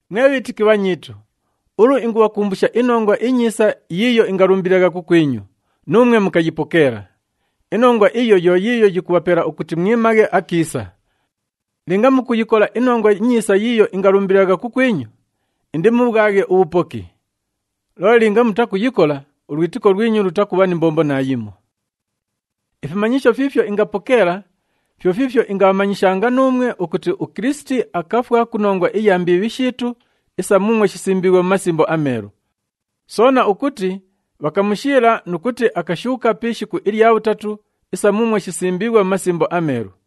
Mwe bhiitiki bhanyiitu, ulu ingubhakumbusha iNongwa iNyiisa yiiyo ingalumbililagha kukwinyu, nuumwe mukayipokeela. Inongwa iyo yo yiiyo yikubhapela ukuti mwimaghe akiisa. Linga mukuyikola iNongwa iNyiisa yiiyo ingalumbililagha kukwinyu, indimubhwaghe ubhupoki. Loole linga mutakuyikola, ulwitiko lwinyu lutakubha ni mbombo naayimo. Ifimanyisho fiifyo ingapokeela, fyo fiifyo ingabhamanyishanga nuumwe ukuti uKilisiti akafwa ku nongwa iya mbiibhi shiitu isa muumwo shisimbiighwe mu Masimbo aMeelu. Soona ukuti bhakamushiila nu kuti akashuuka pi ishiku ilya bhutatu isa muumwo shisimbiighwe mu Masimbo aMeelu.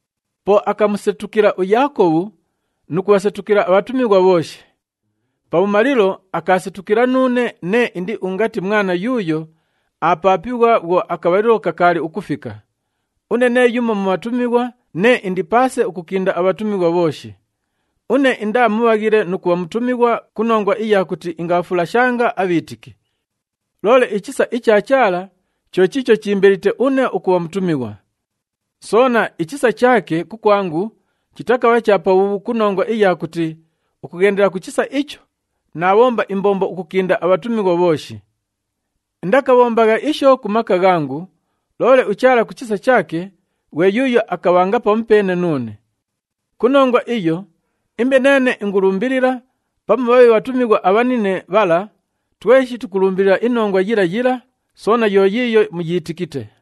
Po akamusetukila uYaakobhu nu kubhasetukila abhatumighwa bhooshi. Pabhumalilo, akaasetukila nuune nee indi ungati mwana yuuyo aapaapighwa bhwo akabhalilo kakaali ukufika. Une nee yumo mu bhatumighwa nee indi paase ukukinda abhatumighwa bhooshi. Une indaa mubhaghile nu kubha mutumighwa ku nongwa iya kuti ingabhafulashanga abhiitiki. Loole ichisa icha Chaala cho chiicho chiimbelite une ukubha mutumighwa. Soona, ichisa chaake kukwangu chitakabha cha pabhuubhu ku nongwa iya kuti ukughendela ku chisa icho naabhomba imbombo ukukinda abhatumighwa bhooshi. Indakabhombagha isho ku maka ghangu, loole uChaala ku chisa chaake ghwe yuuyo akabhanga pamupeene nuune. Ku nongwa iyo, imbe neene ingulumbilila pamu bhabhe bhatumighwa abhanine bhala, tweshi tukulumbilila inongwa yila yila, soona yo yiiyo muyiitikite.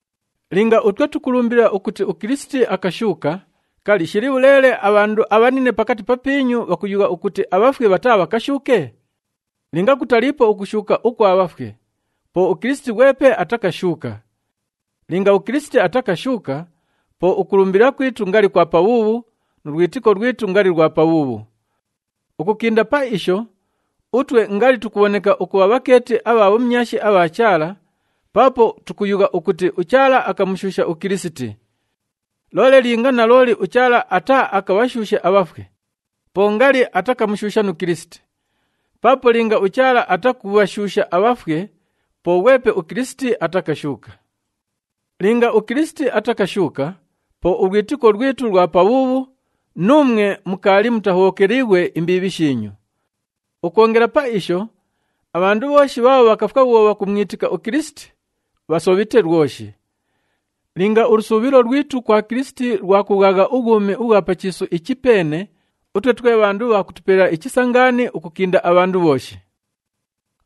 Linga utwe tukulumbilila ukuti uKilisiti akashuuka, kali, shili bhuleele abhandu abhanine pakati papiinyu bhakuyugha ukuti abhafwe bhataabhakashuuke? Linga kutaliipo ukushuuka ukwa bhafwe, po uKilisiti ghwepe atakashuuka. Linga uKilisiti atakashuuka, po ukulumbilila kwitu ngali kwa pabhuubhu, nu lwitiko lwitu ngali lwa pabhuubhu. Ukukinda pa isho, utwe ngali tukubhoneka ukubha bhakeeti abha bhumyashi abha Chaala paapo tukayugha ukuti uChaala akamushuusha uKilisiti. Loole linga nalooli uChaala ataaakabhashuushe abhafwe, po ngali atakamushuusha nu Kilisiti. Paapo linga uChaala atakubhashuusha abhafwe, po ghwepe uKilisiti atakashuuka. Linga uKilisiti atakashuuka, po ulwitiko lwitu lwa pabhuubhu, nuumwe mukaali mutahobhokeliighwe imbiibhi shiinyu. Ukwongela pa isho, abhandu bhooshi bhaabho bhakafwa bhwo bhakumwitika uKilisiti, bhasobhite lwoshi. Linga ulusuubhilo lwitu kwa Kilisiti lwa kubhwagha ubhwumi ubhwa pa chiisu ichi peene, utwe twe bhandu bha kutupelela ichisa ngaani ukukinda abhandu bhooshi.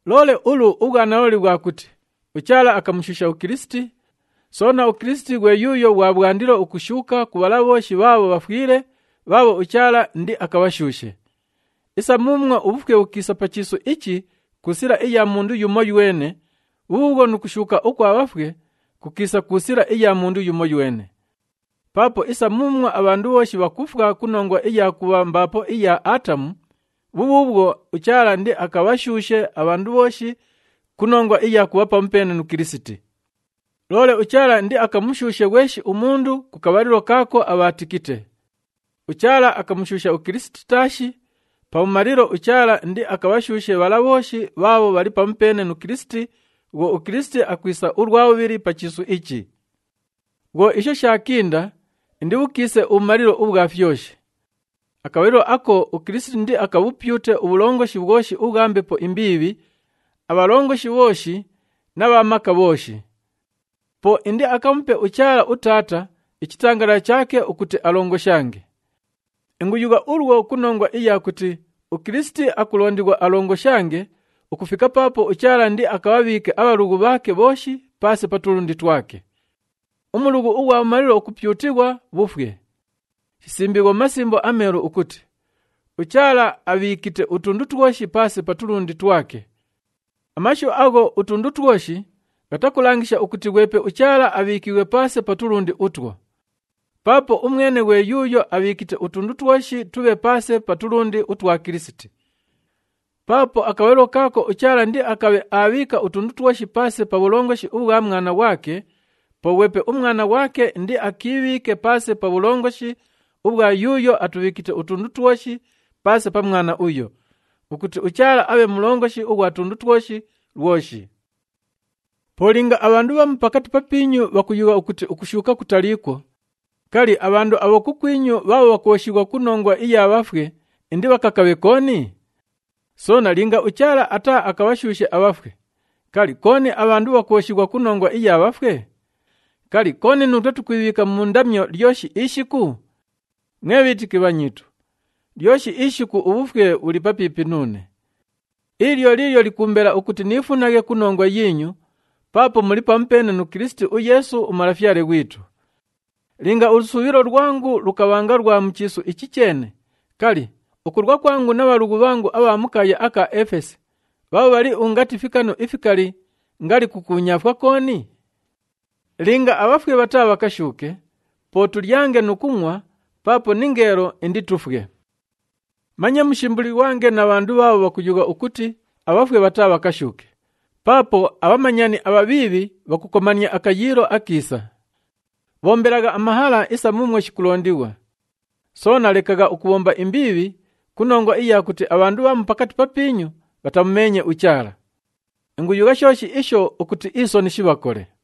Loole ulu, ubhwanalooli bhwa kuti uChaala akamushuusha uKilisiti, soona uKilisiti ghwe yuuyo ghwa bhwandilo ukushuuka ku bhala bhooshi bhaabho bhafwile bhaabho uChaala indiakabhashuushe. Isa muumwo ubhufwe bhukiisa pa chiisu ichi ku sila iya mundu yumoywene, bhubhuubhwo nu kushuuka ukwa bhafwe kukiisa ku sila iya mundu yumoywene. Paapo isa muumwo abhandu bhooshi bhakufwa ku nongwa iya kubha mbaapo iya Aatamu, bhubhuubhwo uChaala indiakabhashuushe abhandu bhooshi ku nongwa iya kubha pamupeene nu Kilisiti. Loole uChaala indiakamushuushe ghweshi umundu ku kabhalilo kaako abhaatikite. UChaala akamushuusha uKilisiti taashi, pabhumalilo uChaala indiakabhashuushe bhala bhooshi bhaabho bhali pamupeene nu Kilisiti bhwo uKilisiti akwisa ulwa bhubhili pa chiisu ichi. Bhwo isho shaakinda, indibhukiise ubhumalilo ubhwa fyoshi. Akabhalilo ako uKilisiti indiakabhupyute ubhulongoshi bhwoshi ubhwa mbepo imbiibhi, abhalongoshi bhooshi na bha maka bhooshi. Po indiakamupe uChaala uTaata ichitangalala chaake ukuti alongoshange. Inguyugha ulwo ku nongwa iya kuti uKilisiti akulondighwa alongoshange ukufika paapo uChaala indiakabhabhiike abhalughu bhaake bhooshi paase pa tulundi twake. Umulughu ughwa bhumalilo ukupyutighwa bhufwe. Shisimbiighwe mu Masimbo aMeelu ukuti, “UChaala abhiikite utundu twoshi paase pa tulundi twake.” Amashu agho “utundu twoshi,” ghatakulangisha ukuti ghwepe uChaala abhiikiighwe paase pa tulundi utwo. Paapo umwene ghwe yuuyo abhiikite utundu twoshi tubhe paase pa tulundi utwa Kilisiti. Paapo akabhalilo kaako uChaala indiakabhe aabhiika utundu twoshi paase pa bhulongoshi ubhwa Mwana ghwake, po ghwepe uMwana ghwake indiakiibhiike paase pa bhulongoshi ubhwa yuuyo atubhiikite utundu twoshi paase pa Mwana uyo, ukuti uChaala abhe Mulongoshi ughwa tundu twoshi lwoshi. Po linga abhandu bhamu pakati papiinyu bhakuyugha ukuti ukushuuka kutaliikwo, kali, abhandu abho kukwinyu bhaabho bhakwoshighwa ku nongwa iya bhafwe indibhakakaaghe kooni? Soona linga uChaala ataaakabhashuushe abhafwe, kali, kooni abhandu bhakwoshighwa ku nongwa iya bhafwe? Kali, kooni nuutwe tukwibhiika mu ndamyo lyoshi ishiku? Mwe bhiitiki bhanyiitu, lyoshi ishiku ubhufwe bhuli papiipi nuune. Ili lyo liilyo likuumbela ukuti niifunaghe ku nongwa yiinyu paapo muli pamupeene nu Kilisiti uYeesu uMalafyale ghwitu. Linga ulusuubhilo lwangu lukabhanga lwa mu chiisu ichi cheene, kali, ukulwa kwangu na bhalughu bhangu abha mu kaaya aka Efesi bhaabho bhali ungati fikanu ifikali ngali kukuunyaafwa kooni? Linga abhafwe bhataabhakashuuke, po “Tulyange nu kungʼwa, paapo ningeelo inditufwe.” Manye mushimbulighwange na bhandu bhaabho bhakuyugha ukuti abhafwe bhataabhakashuuke, paapo, “Abhamanyani abhabhiibhi, bhakukomania akayiilo akiisa.” Bhombelagha amahala isa muumwo shikulondighwa. Soona lekagha ukubhomba imbiibhi ku nongwa iya kuti abhandu bhamu pakati papiinyu bhatamumeenye uChaala. Inguyugha shooshi isho ukuti isoni shibhakole.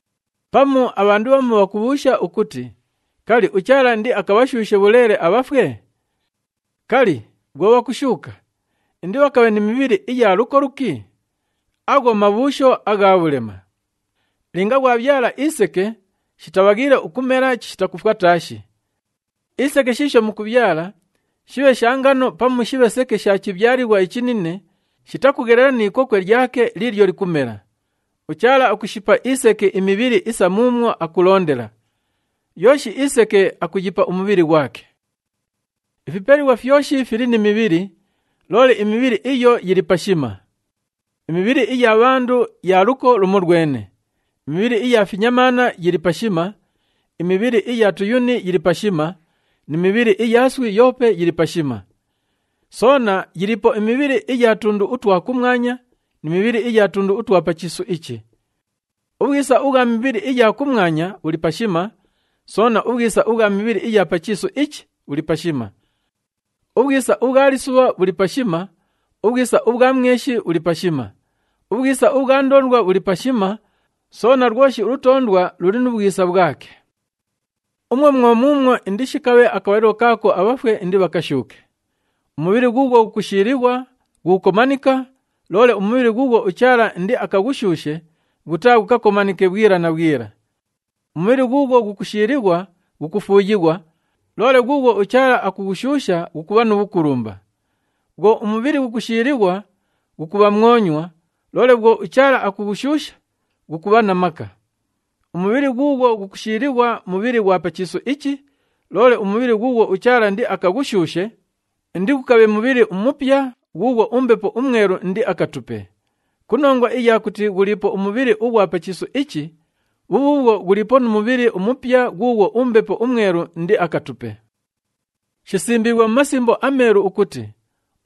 Pamu abhandu bhamu bhakubhuusha ukuti, “Kali, uChaala indiakabhashuushe bhuleele abhafwe? Kali, bhwo bhakushuuka, indibhakabhe ni mibhili iya luko luki?” Agho mabhuusho agha bhulema! Linga ghwabhyala iseke, shitabhaghiile ukumela chishita kufwa taashi. Iseke shiisho mukubhyala, shibhe sha ngano pamu shibhe seke isha chibhyalighwa ichinine, shitakughelela ni ikokwe lyake liilyo likumela. UChaala akushipa iseke imibhili isa muumwo akulondela, yooshi iseke akuyipa umubhili ghwake. Ifipelighwa fyoshi fili ni mibhili, loole imibhili iyo yili pashima. Imibhili iya bhandu ya luko lumolwene, imibhili iya finyamaana yili pashima, imibhili iya tuyuni yili pashima ni mibhili iya iswi yoope yili pashima. Soona yiliipo imibhili iya tundu utwa kumwanya ni mibhili iya tundu utwa pa chiisu ichi. Ubhwisa ubhwa mibhili iya kumwanya bhuli pashima, soona ubhwisa ubhwa mibhili iya pa chiisu ichi bhuli pashima. Ubhwisa ubhwa lisubha bhuli pashima, ubhwisa ubhwa mweshi bhuli pashima, ubhwisa ubhwa ndoondwa bhuli pashima, soona lwoshi ulutoondwa luli nu bhwisa bhwake. Umwo mwo muumwo indishikabhe akabhalilo kaako abhafwe indibhakashuuke. Umubhili ghuughwo ghukushiilighwa, ghukukomanika, loole umubhili ghuughwo uChaala indiakaghushuushe, ghutaaghukakomanike bhwila na bhwila. Umubhili ghuughwo ghukushiilighwa, ghukufuuyighwa, loole ghuughwo uChaala akughushuusha, ghukubha nu bhukulumba. Bhwo umubhili ghukushiilighwa, ghukubha mwonywa, loole bhwo uChaala akughushuusha, ghukubha na maka. Umubhili ghuughwo ghukushiilighwa, mubhili ghwa pa chiisu ichi, loole umubhili ghuughwo uChaala indiakaghushuushe, indighukabhe mubhili umupya ghuughwo uMbepo uMwelu indiakatupe. Ku nongwa iya kuti ghuliipo umubhili ughwa pa chiisu ichi, bhubhuubhwo ghuliipo nu mubhili umupya ghuughwo uMbepo uMwelu indiakatupe. Shisimbiighwe mu Masimbo aMeelu ukuti,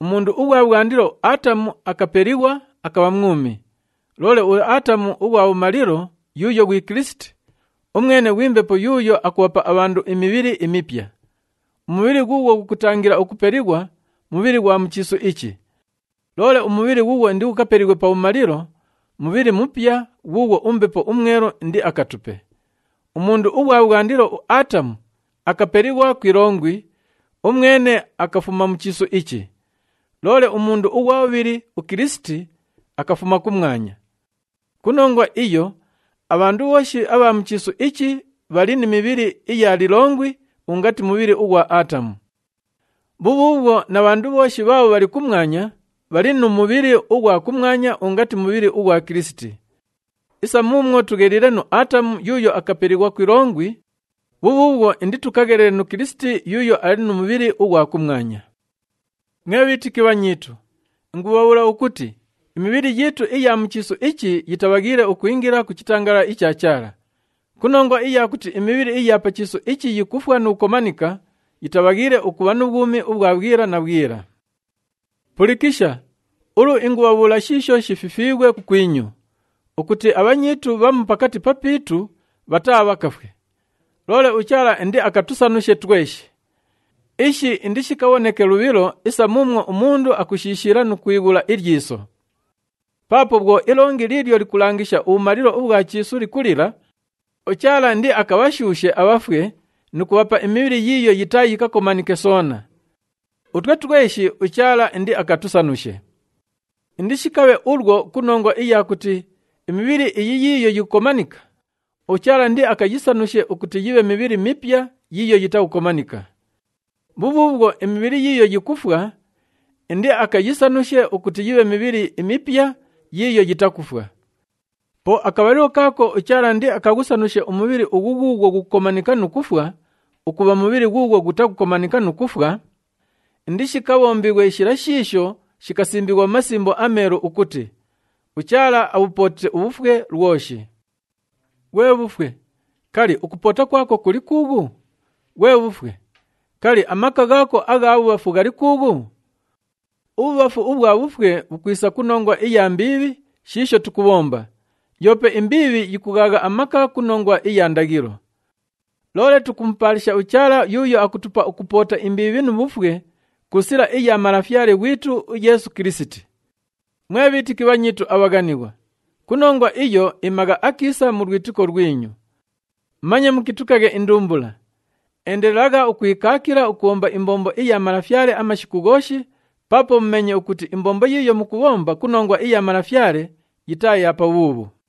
“Umundu ughwa bhwandilo, uAatamu, akapelighwa, akabha mwumi.” Loole uAatamu ughwa bhumalilo yuuyo ghwi Kilisiti, umwene ghwi Mbepo yuuyo akubhapa abhandu imibhili imipya. Umubhili ghuughwo ghukutangila ukupelighwa, mubhili ughwa mu chiisu ichi. Loole umubhili ghuughwo indighukapelighwe pabhumalilo, mubhili mupya ghuughwo uMbepo uMwelu indiakatupe. Umundu ughwa bhwandilo, uAatamu, akapelighwa ku ilongwi, umwene akafuma mu chiisu ichi. Loole umundu ughwa bhubhili, uKilisiti, akafuma kumwanya. Ku nongwa iyo, abhandu bhooshi abha mu chiisu ichi bhali ni mibhili iya lilongwi ungati mubhili ughwa Aatamu. Bhubhuubhwo na bhandu bhooshi bhaabho bhali kumwanya bhali nu mubhili ughwa kumwanya ungati mubhili ughwa Kilisiti. Isa muumwo tugheliile nu Aatamu yuuyo akapelighwa ku ilongwi, bhubhuubhwo inditukaghelele nu Kilisiti yuuyo ali nu mubhili ughwa kumwanya. Mwe bhiitiki bhanyiitu, ingubhabhuula ukuti imibhili yiitu iya mu chiisu ichi yitabhaghiile ukwingila ku chitangalala icha Chaala. Ku nongwa iya kuti imibhili iya pa chiisu ichi yikufwa nu kukomanika, yitabhaghiile ukubha nu bhwumi ubhwa bhwila na bhwila. Pulikisha! Ulu ingubhabhuula shiisho shififiighwe kukwinyu, ukuti abhanyiitu bhamu pakati papiitu bhataabhakafwe, loole uChaala indiakatusanushe tweshi. Ishi indishikabhoneke lubhilo isa muumwo umundu akushishiila nu kwighula ilyiso. Paapo bhwo ilongi liilyo likulangisha ubhumalilo ubhwa chiisu likulila, uChaala indiakabhashuushe abhafwe nu kubhapa imibhili yiiyo yitaayikakomanike soona. Utwe tweshi, uChaala indiakatusanushe. Indishikabhe ulwo ku nongwa iya kuti imibhili iyi yiiyo yikukomanika, uChaala indiakayisanushe ukuti yibhe mibhili mipya yiiyo yitakukomanika. Bhubhuubhwo, imibhili yiiyo yikufwa, indiakayisanushe ukuti yibhe mibhili imipya yiiyo yitakufwa. Po akabhalilo kaako uChaala indiakaghusanushe umubhili ughu ghuughwo ghukukomanika nu kufwa ukubha mubhili ghuughwo ghutakukomanika nu kufwa, indishikabhombighwe shila shiisho shikasimbighwa mu Masimbo aMeelu ukuti, “UChaala abhupootite ubhufwe lwoshi.” “Ghwe bhufwe! Kali, ukupoota kwako kuli kuughu? Ghwe bhufwe! Kali, amaka ghaako agha bhubhafu ghali kuughu?” Ubhubhafu ubhwa bhufwe bhukwisa ku nongwa iya mbiibhi shiisho tukubhomba, yoope imbiibhi yikughaagha amaka ku nongwa iya ndaghilo. Loole tukumupaalisha uChaala yuuyo akutupa ukupoota imbiibhi nu bhufwe ku sila iya Malafyale ghwitu uYeesu Kilisiti. Mwe bhiitiki bhanyiitu abhaghanighwa, ku nongwa iyo, imagha akiisa mu lwitiko lwinyu. Manye mukitukaghe indumbula. Endelelagha ukwikaakila ukubhomba imbombo iya Malafyale amashiku ghooshi paapo mumeenye ukuti imbombo yiiyo mukubhomba ku nongwa iya Malafyale yitaa ya pabhuubhu.